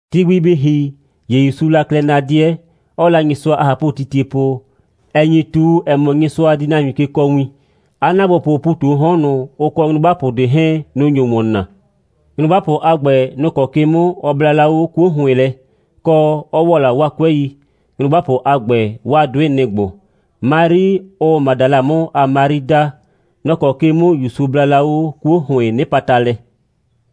Ti gbi bɩ ‑hi, ‑ye ‑Yusuu la klɛ na 'dɩɛ, 'ɔɔ la Nyɩsʋa a ꞊hapʋtitie po, ‑ɛ nyi ꞊tu, ‑ɛ mɔ, Nyɩsʋa di nahuin ke kɔɔ win. 'A ‑naagbopʋʋ ‑pu ꞊tu 'o 'hɔn ꞊nʋ, ʋ kɔ nyrʋgbapʋ ꞊de 'hɛɛn, nʋ‑ nyo ‑wɔn naa. Nyrʋgbapʋ a ‑gbɛ, nʋ‑ kɔ ke 'mʋ ɔ bla la 'o 'kuo ‑hʋɩn lɛ, kɔ, 'ɔ ‑wɔ la 'waa 'kʋɛi. Nyrʋgbapʋ a ‑gbɛ, 'waa 'dʋɩ, nɩ‑ ‑gbo: Mari, ʋʋ Madala 'mʋ a Mari daa; nɔ‑ kɔ ke 'mʋ ‑Yusu bla la 'o 'kuo ‑hʋɩɩn 'nɩpata lɛ;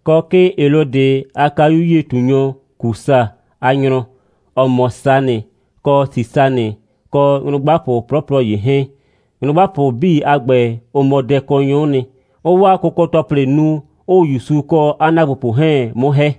kɔ 'kɩɩn Helɔdɩ a kayu'yie꞊tunyɔ Kusa a nyrɔ, ‑ɔ mɔ Sanɩ, kɔ Sisanɩ, kɔ nyrʋgbapʋ 'plɔplɔ ‑ye 'hɛɛn. Nyrʋgbapʋ 'bii a ‑gbɛ, ʋ mɔ dɛkɔnyrʋ'ʋ nɩ, 'ʋʋ 'waa kʋkɔ‑tɔplɩ nu, 'ʋʋ ‑Yusu kɔ 'a ‑naagbopʋ 'hɛɛn 'mʋ ‑hɛ.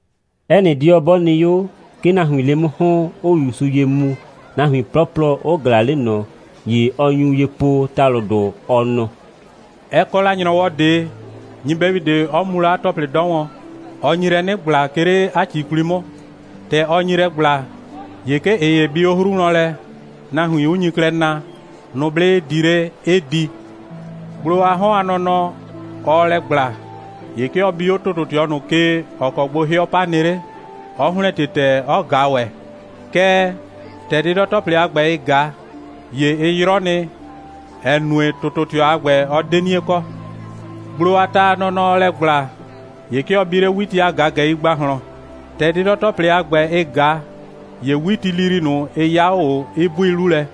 'Ɛ nɩ 'dɩɔ 'bɔ nɩ 'o, 'ke nahuiin 'le 'mʋ ‑hɔn, 'ʋʋ ‑Yusu ye mu, nahuin 'plɔplɔ 'ʋ ꞊glaa 'le ꞊nɔ. ‑Ye ɔ nyu ye po ‑talʋdʋ, ɔ nɔ: «Ɛ kɔ la ‑nyrɔwɔ ꞊de, nyɩbɛyu ꞊de, 'ɔ mu la 'a ‑tɔplɩ 'dɔ wɔn. Ɔ nyi lɛ 'nɩ ‑gbla, 'ke 'le 'a ‑ci 'kwli 'mʋ. ‑Tɛ ɔ nyi lɛ ‑gbla, ‑ye 'ke ꞊ɩ ‑ye bi 'o 'hru wlɔn lɛ, nahuin 'ʋ nyi klɛ na, nʋblɩ 'ɩ di 'le, 'ɩ di. Gblo a 'hɔn a nɔnɔ, ɔɔ lɛ ‑gbla, ‑ye 'ke ɔ bi 'o ‑tʋtʋtɩɔ ꞊nʋ ke, ‑ɔ kɔ gbo 'hɩɔ 'pa nɩ 'le, 'ɔ ‑hlɛntie ‑tɛɛ, 'ɔ ꞊ga ‑wɛ. Kɛɛ, ‑tɛ 'dɩdɔ‑tɔplɩ a ‑gbɛ, ɩ ꞊ga, ‑ye ɩ 'yrɔ nɩ, ‑ɛ nue, ‑tʋtʋtɩɔ a ‑gbɛ, ɔ 'de 'nie kɔ. Gblo a ta a nɔnɔ, ɔɔ lɛ ‑gbla, ‑ye 'ke ɔ bi 'le 'witi a ꞊gagɛi ‑gbahlɔn. ‑Tɛ 'dɩdɔ‑tɔplɩ a ‑gbɛ, ɩ ꞊ga, ‑ye 'witilili ꞊nʋ, ɩ 'ya 'o ꞊o, 'ɩ 'bui 'lu lɛ.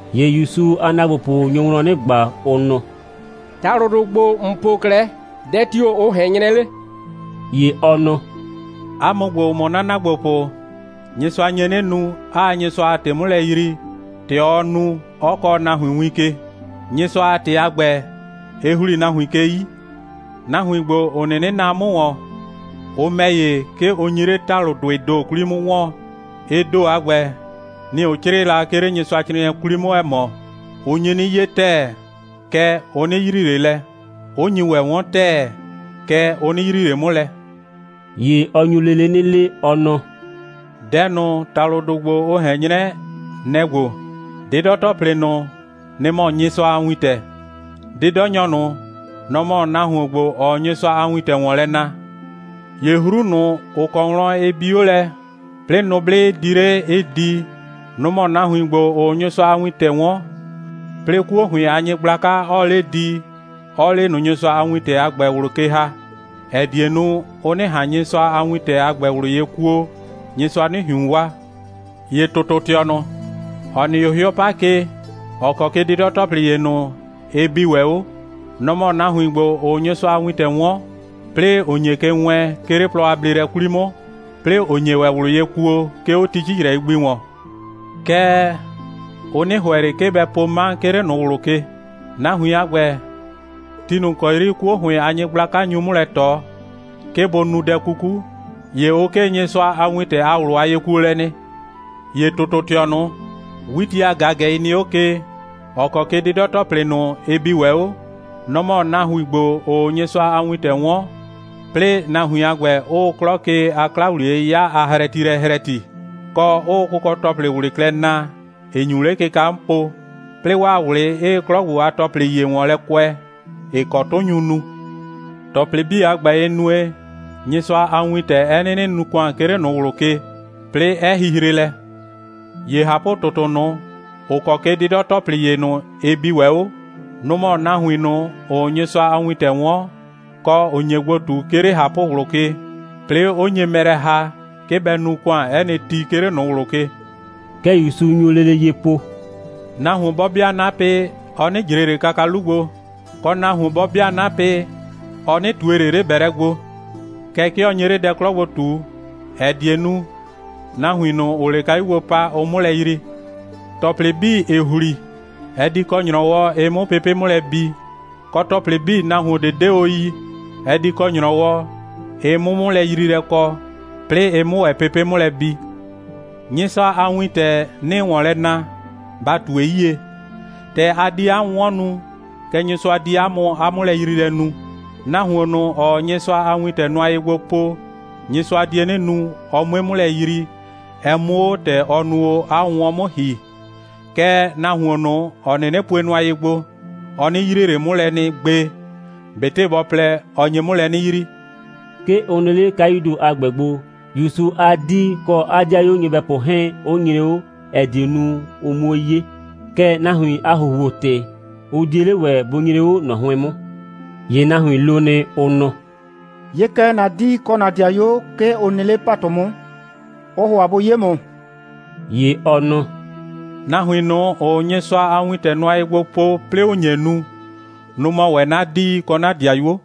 ‑Ye ‑Yusu a ‑naagbopʋ nyo wlɔn 'nɩ ꞊gba, ʋ nɔ: «‑Talʋdʋ ‑gbo, ‑n po 'klɛɛ, dɛ tio‑ ʋ ꞊hɛn 'nyrɛ 'le?» ‑Ye ɔ nɔ: «'A mʋ ‑gbo, ‑ʋ mɔ 'na ‑naagbopʋ, Nyɩsʋa nye 'nɩ nu, 'aa Nyɩsʋa a ‑tɩ 'mʋ lɛ yrii, ‑tɛ ɔɔ nu, 'ɔ kɔɔ nahuin win ke. Nyɩsʋa a ‑tɩ a ‑gbɛ, ɩ ‑hli nahuin ke 'yi. Nahuin ‑gbo, ‑ʋ 'nɩnɩ naa 'mʋ ‑wɔn, ʋ ‑mɛ ‑ye, 'ke ʋ nyi 'le ‑talʋdʋɩɩ ‑do 'kwli 'mʋ 'wɔɔn. Ɩ ‑do a ‑gbɛ, nɩ‑ ʋ 'crɩɩ la, 'ke 'le Nyɩsʋacrɩɩnɩɛ 'kwli 'mʋ, ‑ɛ mɔ: Ʋ nyi 'nɩ 'ye ‑tɛɛ, kɛɛ, ʋ 'nɩ yrii ꞊le lɛ, 'ʋ nyi ‑wɛ 'wɔn ‑tɛɛ, kɛɛ, ʋ 'nɩ yrii ꞊le 'mʋ lɛ.» ‑Ye ɔ nyu lele 'nɩ le, ɔ nɔ: «Dɛ ꞊nʋ, ‑talʋdʋ a ‑gbɛ, ʋ ꞊hɛn 'nyrɛ, nɛ‑ ‑gbo: 'Dɩdɔ‑tɔplɩ ꞊nʋ, nɩ‑ mɔ Nyɩsʋa a wintɛ. 'Dɩdɔnyɔ ꞊nʋ, nɔ‑ mɔ nahuon ‑gbo, ‑ɔɔ Nyɩsʋa a wintɛ ‑wɔn lɛ na. ‑Ye 'hru ꞊nʋ, ‑ʋ kɔ wlɔn ɩ bi 'o lɛ, 'plɩɩ nʋblɩ 'ɩ di 'le, 'ɩ di, nʋ‑ mɔ nahuin ‑gbo, ‑ʋʋ Nyɩsʋa a wintɛ 'wɔn, 'plɩɩ 'kuo ‑hʋɩn a nyɩgblaka, 'ɔɔ 'le di, 'ɔɔ 'le ꞊nʋ Nyɩsʋa a wintɛ a ‑gbɛ ꞊wlʋ ke ‑ha, ‑ɛ die nu, ʋ 'nɩ ꞊han Nyɩsʋa a wintɛ a ‑gbɛ ꞊wlʋ ye kuo, Nyɩsʋa 'nɩ ꞊hiun waa. ‑Ye ‑tʋtʋtɩɔ ꞊nʋ, ‑ɔ nɩ 'o 'hɩɔ 'pa ke, ‑ɔ kɔ ke 'dɩdɔ‑tɔplɩ ‑ye ꞊nʋ, ɩ bi ‑wɛ 'o, nɔ‑ mɔ nahuin ‑gbo, ‑ʋʋ Nyɩsʋa a wintɛ 'wɔn, 'plɩɩ ‑ʋ nye ke wɛɛn, 'ke 'le plɔ a bleelɛ 'kwli 'mʋ, 'plɩɩ ‑ʋ nye ‑wɛ ꞊wlʋ ye kuo, 'ke 'o ti 'cicrɛi gbi ‑wɔn. Kɛɛ, ʋ 'nɩ ‑hʋɛ ꞊le, 'ke bɛ po 'ma, 'ke 'le ꞊nʋ ꞊wlʋ ke. Nahuin a ‑gbɛ, ti ꞊nʋ ‑kɔ 'yri 'kuo ‑hʋɩn a nyɩgblaka nyu 'mʋ lɛ ꞊tɔ, 'ke bʋ nu dɛ 'kuku, ‑ye ʋ 'kee Nyɩsʋa a wintɛ a ꞊wlʋ a yekuolɛ nɩ. ‑Ye ‑tʋtʋtɩɔ ꞊nʋ, 'witi a ꞊gagɛi nɩ 'o ke, ‑ɔ kɔ ke 'dɩdɔ‑tɔplɩ ꞊nʋ, ɩ bi ‑wɛ 'o, nɔ‑ mɔ nahuin ‑gbo, ‑ʋʋ Nyɩsʋa a wintɛ 'wɔn, 'plɩɩ nahuin a ‑gbɛ 'ʋʋ 'klɔ ke a 'kla‑wliye'yɩya a hrɛtilɛ hrɛti, kɔ 'ʋʋ kʋkɔ‑tɔplɩ ꞊wlɩ klɛ naa, ‑ɩ nyu 'le kɩka 'mʋ po, 'plɩɩ 'waa ꞊wlɩ 'ɩɩ 'klɔ ‑gbo a ‑tɔplɩ ‑ye ‑wɔn lɛ kʋɛ, ‑ɩ kɔ 'tʋ nyu nu. ‑Tɔplɩ 'bii a ‑gbɛ, ɩ nue, Nyɩsʋa a wintɛ, 'ɛ 'nɩnɩ nu ‑kʋan, 'ke 'le ꞊nʋ ꞊wlʋ ke, 'plɩɩ 'ɛ hihre lɛ. ‑Ye ꞊hapʋ‑tʋtʋ ꞊nʋ, ‑ʋ kɔ ke 'dɩdɔ‑tɔplɩ ‑ye ꞊nʋ, ɩ bi ‑wɛ 'o, nʋ‑ mɔ nahuin ꞊nʋ, ‑ʋʋ Nyɩsʋa a wintɛ 'wɔn, kɔ, ‑ʋ nye gbo ꞊tu, 'ke 'le ꞊hapʋ꞊wlʋ ke, 'plɩɩ 'ʋ nye mɛ lɛ ‑ha, 'ke bɛ nu ‑kʋan 'ɛ nɩ ti, 'ke 'le ꞊nʋ ꞊wlʋ ke.» Kɛ ‑Yusu nyu lele ye po: «Nahuon 'bɔ 'bɩa 'napɩ, ɔ 'nɩ ꞊jre ꞊le kaka 'lu gbo, kɔ, nahuon 'bɔ 'bɩa 'napɩ, ɔ 'nɩ ꞊tue ꞊le 'le ‑bɛlɛ gbo. Kɛɛ, 'ke ɔ nye 'le dɛ 'klɔ gbo ꞊tu, ‑ɛ die nu, nahuin ꞊nʋ, ‑ʋʋ 'le kayu gbo pa, ʋ 'mʋ lɛ yrii. ‑Tɔplɩ 'bii, ‑ɩ ‑hli, ɛ di kɔ ‑nyrɔwɔ, ɩ 'mʋ pepe' 'mʋ lɛ bi, kɔ, ‑tɔplɩ 'bii, nahuon ꞊de 'de o yi, ɛ di kɔ ‑nyrɔwɔ, ɩ 'mʋ 'mʋlɛyriilɛ kɔ, 'plɩɩ ɩ 'mʋ ‑wɛ pepe' 'mʋ lɛ bi. Nyɩsʋa a wintɛ, 'nɩɩ ‑wɔn lɛ na, ba ꞊tue 'yie. ‑Tɛ a di 'a 'wʋnwɔn nu, kɛ Nyɩsʋa di 'a mʋ 'a 'mʋlɛyriilɛ nu. Nahuon ꞊nʋ, ‑ɔɔ Nyɩsʋa a wintɛ nʋa ye gbo po, Nyɩsʋa die 'nɩ nu, ɔ 'mue 'mʋ lɛ yrii, ɛ 'mʋ 'o ‑tɛ ɔ nu o 'a 'wʋnwɔn 'mʋ ‑hi. Kɛɛ, nahuon ꞊nʋ, ‑ɔ 'nɩnɩ pue nʋa ye gbo, ɔ 'nɩ yrie ꞊le 'mʋ lɛ nɩ gbe, ꞊betɩ bɔ plɛ, ɔ nye 'mʋ lɛ 'nɩ yrii.» 'Ke ʋ nɩ 'le kayuu ‑do a ‑gbɛ gbo, ‑Yusu a 'dii kɔ 'a 'dɩayuo nyɩbɛpʋ 'hɛɛn 'ʋ nyre 'o, ‑ɛ die nu, ʋ 'muo 'ye. Kɛɛ, nahuin a ‑huhuo‑tɩ, ʋ 'die 'le ‑wɛ bʋ nyre 'o ꞊nɔ 'hʋɩn 'mʋ. ‑Ye nahuin lo nɩ, ʋ nɔ: «'Ye kɛ, ‑na 'dii kɔ ‑na 'dɩayuo, 'ke ʋ nɩ 'le ‑patʋ 'mʋ, 'ʋʋ ‑hʋa bʋ 'ye ‑mʋ.» ‑Ye ɔ nɔ: «Nahuin ꞊nʋ, ‑ʋʋ Nyɩsʋa a wintɛ nʋa ye gbo po, 'plɩɩ ‑ʋ nye nu, nʋ‑ mɔ ‑wɛ 'na 'dii kɔ 'na 'dɩayuo.»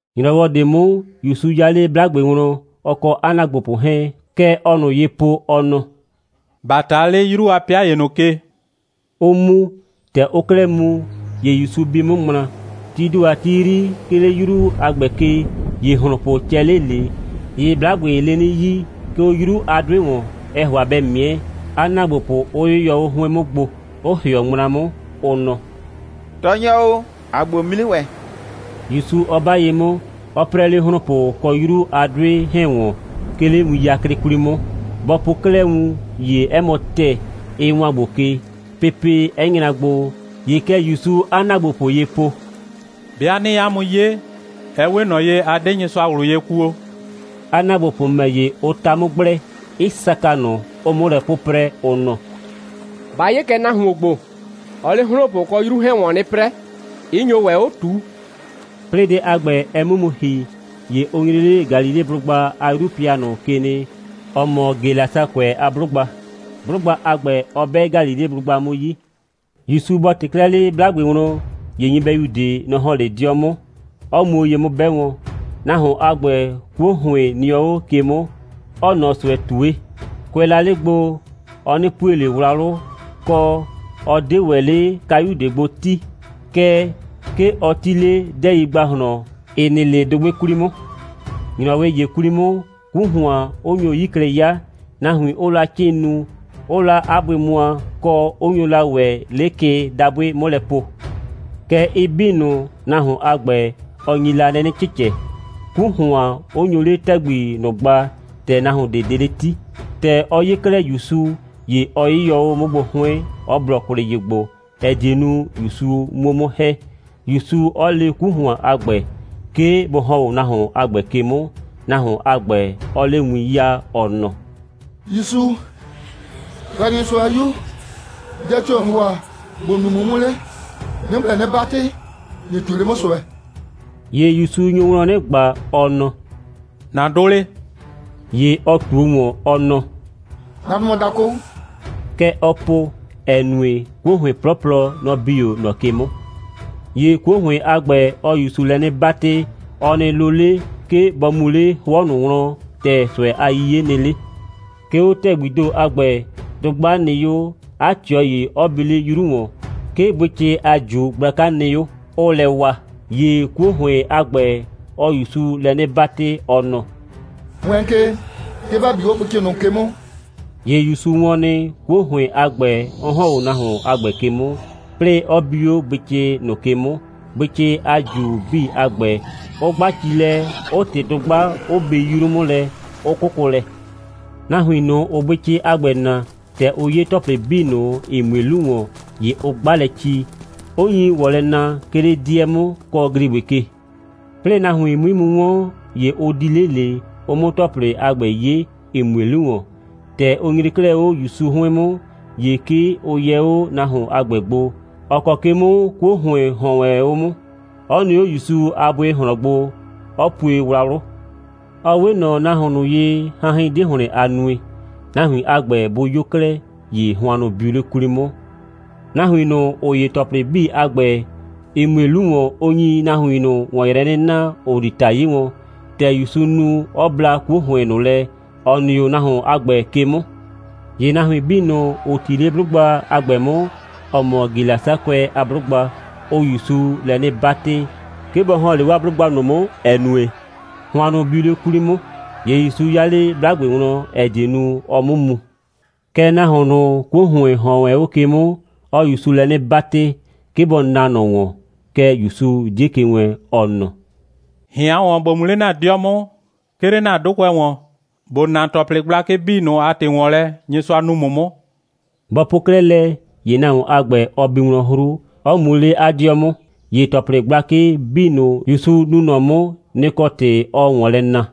‑Nyrɔwɔ ꞊de 'mʋ, ‑Yusu 'ya 'le 'blagbe wlɔn, ɔ kɔ 'a ‑naagbopʋ 'hɛɛn. Kɛ ɔɔ ꞊nʋ ye po, ɔ nɔ: «‑Ba ꞊ta 'le 'yru a 'pɩa ‑ye ꞊nʋ ke!» 'ʋ mu. ‑Tɛ ʋʋ 'klɛɛ mu, ‑ye ‑Yusu bi 'mʋ ŋmla. Tii ‑do a ti 'yri, 'ke 'le 'yru a ‑gbɛ ke, ‑ye ‑hlonpʋ cɛ 'le ꞊le. ‑Ye 'blagbee 'le 'nɩ 'yii, 'ke 'o 'yru a 'dʋɩ ‑wɔn, ɛɛ ‑hʋa bɛ ꞊mɩɛ, 'a ‑naagbopʋ 'ʋ 'yɩyɔ 'o 'hʋɩn 'mʋ gbo, 'ʋ ‑hɩɔ ŋmla 'mʋ, ʋ nɔ: «Tɔɔnyɔ o, ‑aa gbo mu 'nɩ ‑wɛ,» ‑Yusu 'ɔ 'ba ye 'mʋ, 'ɔ 'prɛɛ 'le ‑hlonpʋ kɔ 'yru a 'dʋɩ 'hɛɛn ‑wɔn, 'ke 'le win 'yaklɩkɔ 'kwli 'mʋ. Bɔ po 'klɛɛ wun, ‑ye 'ɛ mɔ ‑tɛɛ, ɩ ‑wan gbo ke, pepe 'ɛ nyra gbo. ‑Ye kɛ ‑Yusuu 'a ‑naagbopʋ ye po: «'Bɩa 'nɩɩ 'a mʋ 'ye, ɛ 'we ꞊nɔ ye, a 'de Nyɩsʋa ꞊wlʋ ye kuo.» 'A ‑naagbopʋ ‑mɛ ‑ye, ʋ 'ta 'mʋ gblɛ, 'ɩ saka ꞊nʋ, 'ʋʋ 'mʋ lɛ 'pʋprɛ, ʋ nɔ: «Ba 'ye kɛ nahuon ‑gbo. Ɔɔ 'le ‑hlonpʋ kɔ 'yru 'hɛɛn ‑wɔn 'nɩ 'prɛɛ, 'ɩ nyo ‑wɛ 'o ꞊tuu.» 'Plɩɩ dɛ a ‑gbɛ, ɛ 'mʋ mu ‑hi, ‑ye ʋ nyre 'le Galileblʋgba a 'yru a 'pɩa ꞊nʋ ke nɩ, ‑ɔ mɔ Gelasakʋɛ a 'blʋgba. 'Blʋgba a ‑gbɛ, ɔ 'bɛ Galileblʋgba 'mʋ 'yi. ‑Yusu bɔ ꞊tɩ 'klɛɛ 'le 'blagbe wlɔn, ‑ye nyɩbɛyu ꞊de, nɔ‑ ‑hɔn 'le 'dɩɔ ꞊nʋ 'mʋ, 'ɔ muo ye 'mʋ 'bɛ wɔn. Nahuon a ‑gbɛ, 'kuo ‑hʋɩn nɩɔ 'o ke 'mʋ, 'ɔɔ ꞊nɔ ꞊sʋɛ ꞊tue. Kʋɛ la 'le gbo, ɔ 'nɩ pue ꞊le wlawlʋ, kɔ, ɔ 'de ‑wɛ 'le kayu ꞊de gbo 'ti, kɛɛ, 'ke ɔ 'ti 'le 'dɛɛi ‑gbahlɔn, ‑ɩ nɩ 'le dʋgbɩ 'kwli 'mʋ. ‑Nyrɔwɩ ‑ye 'kwli 'mʋ, 'ku ‑hʋan 'ʋ nyo 'yi klɛ 'ya, nahuin 'ʋʋ la 'cɩɩn nu, 'ʋʋ la 'a bʋɩ mʋa, kɔ, 'ʋ nyo la ‑wɛ 'le kɩ dabʋɩ 'mʋ lɛ po. Kɛɛ, ɩ 'bii ꞊nʋ, nahuon a ‑gbɛ, ɔ nyi la lɛ 'nɩ cɩcɛ, 'ku ‑hʋan 'ʋ nyo 'le ‑tɛgbi ꞊nʋ gba, ‑tɛ nahuin ꞊de 'de 'le 'ti. ‑Tɛ ɔ 'ye 'klɛɛ ‑Yusu, ‑ye ɔ 'yɩyɔ 'o 'mʋ gbo 'hʋɩn, 'ɔ blɔ kwlɩ ye gbo, ‑ɛ die nu, ‑Yusu 'muo 'mʋ ‑hɛ, ‑Yusu 'ɔ le 'ku ‑hʋan a ‑gbɛ, 'ke bʋ ‑hɔn 'o nahuon a ‑gbɛ 'ke 'mʋ, nahuon a ‑gbɛ, 'ɔɔ 'le win 'yaa, ɔ nɔ: «‑Yusu, Yrayrɩnyɩsʋa a 'Yu, dɛ tio‑ ‑n ‑hʋa ‑bo nu 'mʋ 'mʋ 'le? 'Nɩɩ ‑mʋ lɛ 'nɩ 'batɩ, ꞊nɩ ꞊tue 'le 'mʋ ꞊sʋɛ.» ‑Ye ‑Yusu nyo wlɔn 'nɩ ꞊gba, ɔ nɔ: «‑Na 'dʋ 'le?» ‑Ye ɔ ꞊tuo ‑wɔn, ɔ nɔ: «'Na 'dʋ mɔ dakʋ.» Kɛ ɔ po, ‑ɛ nue, 'kuo ‑hʋɩn 'plɔplɔ, nɔ‑ bi 'o ꞊nɔ ke 'mʋ. ‑Ye 'kuo ‑hʋɩn a ‑gbɛ, ɔɔ ‑Yusu lɛ 'nɩ 'batɩ, ɔ nɩ lo 'le, 'ke bɔ mu 'le 'hʋɔ ꞊nʋ wlɔn, ‑tɛ ꞊sʋɛ a 'yiye nɩ 'le. 'Ke 'o ‑tɛgbii ‑do a ‑gbɛ, dʋgba nɩ 'o, 'a ꞊tɩɔ ‑ye 'ɔ bi 'le 'yru ‑wɔn. 'Ke bʋɩcɩ a ꞊ju gblaka nɩ 'o, 'ʋʋ lɛ wa. ‑Ye 'kuo ‑hʋɩn a ‑gbɛ, ɔɔ ‑Yusu lɛ 'nɩ 'batɩ, ɔ nɔ: «Wɛɛn ke, 'ke ‑ba bi 'o bʋɩcɩ ꞊nʋ ke 'mʋ!» ‑Ye ‑Yusu wɔn nɩ, 'kuo ‑hʋɩn a ‑gbɛ 'ɔ ‑hɔn 'o nahuon a ‑gbɛ ke 'mʋ, 'plɩɩ 'ɔ bi 'o bʋɩcɩ ꞊nʋ ke 'mʋ, bʋɩcɩ a ꞊ju 'bii a ‑gbɛ, 'ʋ 'gba ci lɛ, 'ʋ ꞊tɩ dʋgba, 'ʋ bi 'yru 'mʋ lɛ, 'ʋ 'kʋkʋ lɛ. Nahuin ꞊nʋ, ‑ʋʋ bʋɩcɩ a ‑gbɛ naa, ‑tɛ ʋ 'ye ‑tɔplɩ 'bii ꞊nʋ, ‑ɩ mue 'lu ‑wɔn, ‑ye ʋ 'gba lɛ ci, 'ʋ nyi ‑wɔn lɛ na, 'ke 'le 'dɩɛ 'mʋ, kɔ ‑gligbɩ ke. 'Plɩɩ nahuin 'mui mu 'wɔn, ‑ye ʋ di 'le ꞊le, ʋ 'mʋ ‑tɔplɩ a ‑gbɛ 'ye, ‑ɩ mue 'lu ‑wɔn. ‑Tɛ ʋ nyre 'klɛɛ 'o ‑Yusu 'hʋɩn 'mʋ, ‑ye 'ke ʋ yɛ 'o nahuon a ‑gbɛ gbo, ‑ɔ kɔ ke 'mʋ 'kuo ‑hʋɩn ‑hɔn wɛn 'o 'mʋ, 'ɔ nɩ 'o ‑Yusu a bʋɩ ꞊hlɔn gbo, 'ɔ pue wlawlʋ. Ɔ 'we ꞊nɔ nahuon ꞊nʋ ye, hanhɩn 'de ‑hlɩn a nue. Nahuin a ‑gbɛ bʋ 'yo 'klɛɛ, ‑ye hʋannʋ biu 'le 'kwli 'mʋ. Nahuin ꞊nʋ, ‑ʋ 'ye ‑tɔplɩ 'bii a ‑gbɛ, ‑ɩ mue 'lu ‑wɔn, ʋ nyi nahuin ꞊nʋ ‑wɔn yrɛ 'nɩ na, ‑ʋ di ‑ta 'ye wɔn, ‑tɛ ‑Yusu nu, 'ɔ bla 'kuo ‑hʋɩn ꞊nʋ lɛ, ‑ɔ nɩ 'o nahuon a ‑gbɛ ke 'mʋ. ‑Ye nahuin 'bii ꞊nʋ, ‑ʋ 'ti 'le 'blʋgba a ‑gbɛ 'mʋ, ‑ɔ mɔ Gelasakʋɛ a 'blʋgba, ʋʋ ‑Yusu lɛ 'nɩ 'batɩ, 'ke bɔ ‑hɔn 'le 'waa 'blʋgba ꞊nʋ 'mʋ, ‑ɛ nue, hʋannʋ biu 'le 'kwli 'mʋ. ‑Ye ‑Yusu 'ya 'le 'blagbe wlɔn, ‑ɛ die nu, ɔ 'mʋ mu. Kɛɛ, nahuon ꞊nʋ, 'kuo ‑hʋɩn ‑hɔn wɛn 'o ke 'mʋ, ɔɔ ‑Yusu lɛ 'nɩ 'batɩ, 'ke bɔ naa ꞊nɔ ‑wɔn. Kɛɛ, ‑Yusu 'die ke wɛɛn, ɔ nɔ: «꞊Hɩan ‑wɔn, ‑bo mu 'le ‑na 'dɩɔ 'mʋ, 'ke 'le ‑na 'dʋkʋɛ ‑wɔn, ‑bo na ‑tɔplɩ gblakɩ 'bii ꞊nʋ a ‑tɩ ‑wɔn lɛ, Nyɩsʋa nu ‑mʋ 'mʋ.» Bɔ po 'klɛɛ lɛ, ‑ye nahuon a ‑gbɛ, ɔ bi wlɔn 'hru, 'ɔ mu 'le 'a 'dɩɔ 'mʋ. ‑Ye ‑tɔplɩ gblakɩ 'bii ꞊nʋ, ‑Yusu nu ꞊nɔ 'mʋ, nɩ‑ kɔ ‑tɩ, ɔɔ ‑wɔn lɛ na.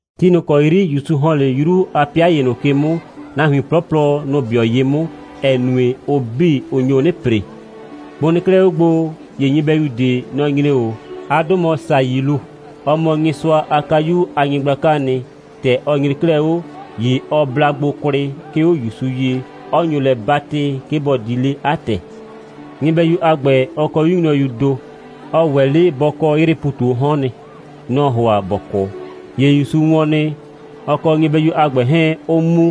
Ti ꞊nʋ ‑kɔ 'yri ‑Yusu ‑hɔn 'le 'yru a 'pɩa ‑ye ꞊nʋ ke 'mʋ, nahuin 'plɔplɔ, nʋ‑ 'bɩɔ ye 'mʋ, ‑ɛ nue, ʋ 'bii, ʋ nyo 'nɩ ‑pre. Bʋ nɩ 'klɛɛ 'o gbo, ‑ye nyɩbɛyu ꞊de, nɔ‑ nyre 'o. 'A 'dʋ mɔ Sayilu. Ɔ mɔ Nyɩsʋa a kayu a nyɩgblakaa nɩ. ‑Tɛ ɔ nyre 'klɛɛ 'o, ‑ye ɔ bla gbo kwlɩ, 'ke 'o ‑Yusu ye, 'ɔ nyo lɛ 'batɩ, 'ke bɔ di 'le 'a ‑tɛ. Nyɩbɛyu a ‑gbɛ, ɔ kɔ 'yu nyrɔyuu ‑do. Ɔ ‑wɛ 'le bɔ kɔ 'yrɩɩ ‑pu ꞊tu 'o 'hɔn nɩ. Nɔ‑ɔ ‑hʋa ‑bɔ 'kʋ. ‑Ye ‑Yusu wɔn nɩ, ɔ kɔ nyɩbɛyu a ‑gbɛ 'hɛɛn 'ʋʋ mu,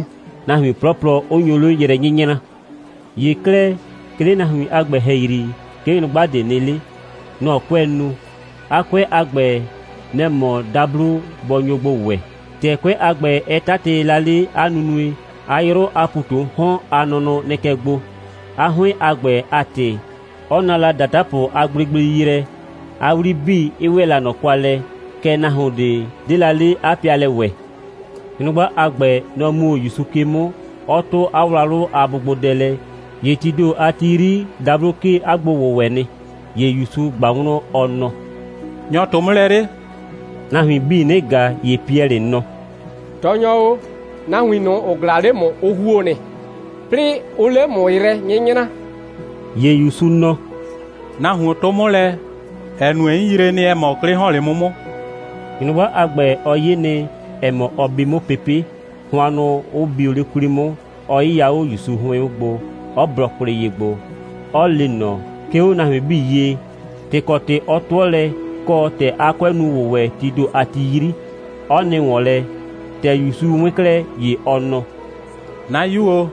nahuin 'plɔplɔ 'ʋ nyo 'le yrɛ 'nyɩnyraa. ‑Ye 'klɛɛ, 'ke 'le nahuin a ‑gbɛ ‑hɛyri, 'ke nyrʋgba ꞊de nɩ 'le. Nɔ‑ 'kʋɛɛ nu. 'A 'kʋɛ a ‑gbɛ, nɛ‑ mɔ dablo bɔ nyo gbo ‑wɛ. ‑Tɛ 'kʋɛ a ‑gbɛ, ɛ 'tatɩ la 'a nunue, 'a 'yrʋ a ‑pu ꞊tu 'o 'hɔn a nʋnʋ nɩ kɛ gbo. 'A 'hʋɩn a ‑gbɛ a ‑tɩ, 'ɔ na la ‑datapʋ a gblegblei yrɛ, 'a 'wli 'bii 'ɩ ‑wɛ la ꞊nɔ kwa lɛ. Kɛɛ, nahuon ꞊de 'de la 'le 'a pɩalɛ ‑wɛ. Nyrʋgba a ‑gbɛ, nɔ‑ mu 'o ‑Yusu ke 'mʋ, 'ɔ 'tʋ 'a wlawlʋ a bʋgbodɛ lɛ. ‑Ye tii ‑do a ti 'yri, dablo 'kee 'a gbo‑wʋwɛ nɩ. ‑Ye ‑Yusu ꞊gba wlɔn, ɔ nɔ: «Nyɔ‑ 'tʋ 'mʋ lɛ 'le?» Nahuin 'bii 'nɩ ꞊ga, ‑ye Piɛlɩ nɔ: «Tɔɔnyɔ o, nahuin ꞊nʋ, ‑ʋ ꞊glaa 'le ‑mʋ, ʋ ‑huo nɩ, 'plɩɩ 'ʋʋ 'le ‑mʋ yrɛ 'nyɩnyraa.» ‑Ye ‑Yusu nɔ: «Nahuon 'tʋ 'mʋ lɛ, ‑ɛ nue, 'n yree nɩ, ‑ɛ mɔ, 'klɩ ‑hɔn 'le 'mʋ 'mʋ.» Nyrʋgba a ‑gbɛ, ɔ 'ye nɩ, ‑ɛ mɔ, ɔ bi 'mʋ pepe', hʋannʋ 'ʋ bio 'le 'kwli 'mʋ, 'ɔ 'yɩya 'o ‑Yusu 'hʋɩn 'mʋ gbo, 'ɔ blɔ kwlɩ ye gbo, 'ɔ le ꞊nɔ, 'ke 'o nahuin 'bii ye, ‑tɩ ‑kɔ ‑tɩ 'ɔ 'tʋɔ lɛ, kɔ, ‑tɛ 'a kʋɛ nu ‑wʋwɛ tii ‑do a ti 'yri, 'ɔ nɩ ‑wɔn lɛ. ‑Tɛ ‑Yusu 'wɩn 'klɛɛ, ‑ye ɔ nɔ: «'Na 'yu o,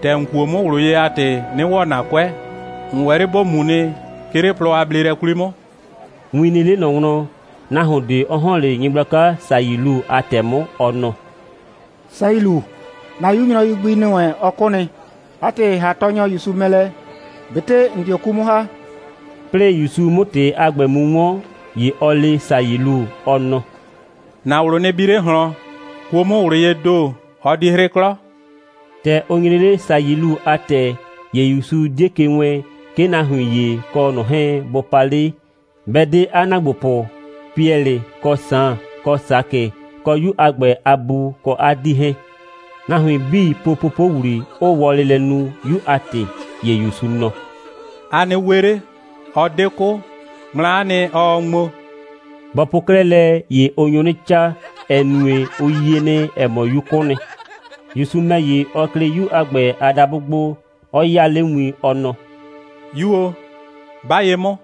‑tɛ ‑n kuo 'mʋ ꞊wlʋ ye a ‑tɩ, 'nɩ ‑wɔ ‑na 'kʋɛ. ‑N ‑wɛ 'le ‑bo mu nɩ, 'ke 'le plɔ a bleelɛ 'kwli 'mʋ.» Win nɩ 'le ꞊nɔ wlɔn, nahuon ꞊de 'ɔ ‑hɔn 'le nyɩgblaka Sayilu a ‑tɛ 'mʋ, ɔ nɔ: «Sayilu, ‑na 'yu nyrɔyu gbi ‑nɩ wɛn, ɔ 'kʋ nɩ. 'A ‑tɩ, ‑ha Tɔɔnyɔ ‑Yusu mɛ lɛ, ꞊betɩ ‑n dio 'ku 'mʋ ‑ha.» 'Plɩɩ ‑Yusu 'mʋ ‑tɩ a ‑gbɛ mu 'wɔn, ‑ye ɔ le Sayilu, ɔ nɔ: «‑Na ꞊wlʋ nɩ bi 'le ꞊hlɔn, kuo 'mʋ ꞊wlʋ yee ‑do, ɔ di 'hrɩ 'klɔ.» ‑Tɛ ʋ nyre 'le Sayilu a ‑tɛ, ‑ye ‑Yusu 'die ke wɛɛn, 'ke nahuin ‑ye kɔ ꞊nɔ 'hɛɛn, bʋ pa 'le, 'bɛ 'de 'a ‑naagbopʋ Piɛlɩ, kɔ Saan, kɔ Sakɩ, kɔ 'yu a ‑gbɛ a bu kɔ 'a 'dii 'hɛɛn. Nahuin 'bii po popowlii, 'ʋʋ wɔlɩ lɛ nu, 'yu a ‑tɩ. ‑Ye ‑Yusu nɔ: «A nɩ we 'le! Ɔ 'de 'kʋ. Ŋmla'a nɩ, ɔɔ ŋmo.» Bɔ po 'klɛɛ lɛ, ‑ye ʋ nyo 'nɩ 'caa, ‑ɛ nue, ʋ yie nɩ, ‑ɛ mɔ, 'yu 'kʋ nɩ. ‑Yusu ‑mɛ ‑ye, ɔ klɩ 'yu a ‑gbɛ a dabʋ gbo, 'ɔ 'yaa 'le win, ɔ nɔ: «'Yu o, 'ba ye 'mʋ!»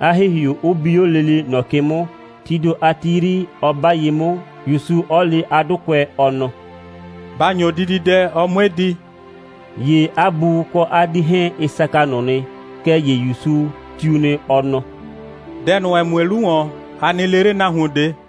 'a ‑hihiu 'ʋ bi 'o lele ꞊nɔ ke 'mʋ, tii ‑do a ti 'yri, 'ɔ 'ba ye 'mʋ, ‑Yusu 'ɔ le 'a 'dʋkʋɛ, ɔ nɔ: «Ba ‑nyo dididɛ, ɔ 'mue di.» ‑Ye 'a bu kɔ 'a 'dii 'hɛɛn, ɩ saka ꞊nʋ nɩ. Kɛɛ ‑ye ‑Yusu tiu nɩ, ɔ nɔ: «Dɛ ꞊nʋ, ‑ɛ mue 'lu ‑wɔn, a nɩ le 'le nahuon ꞊de.»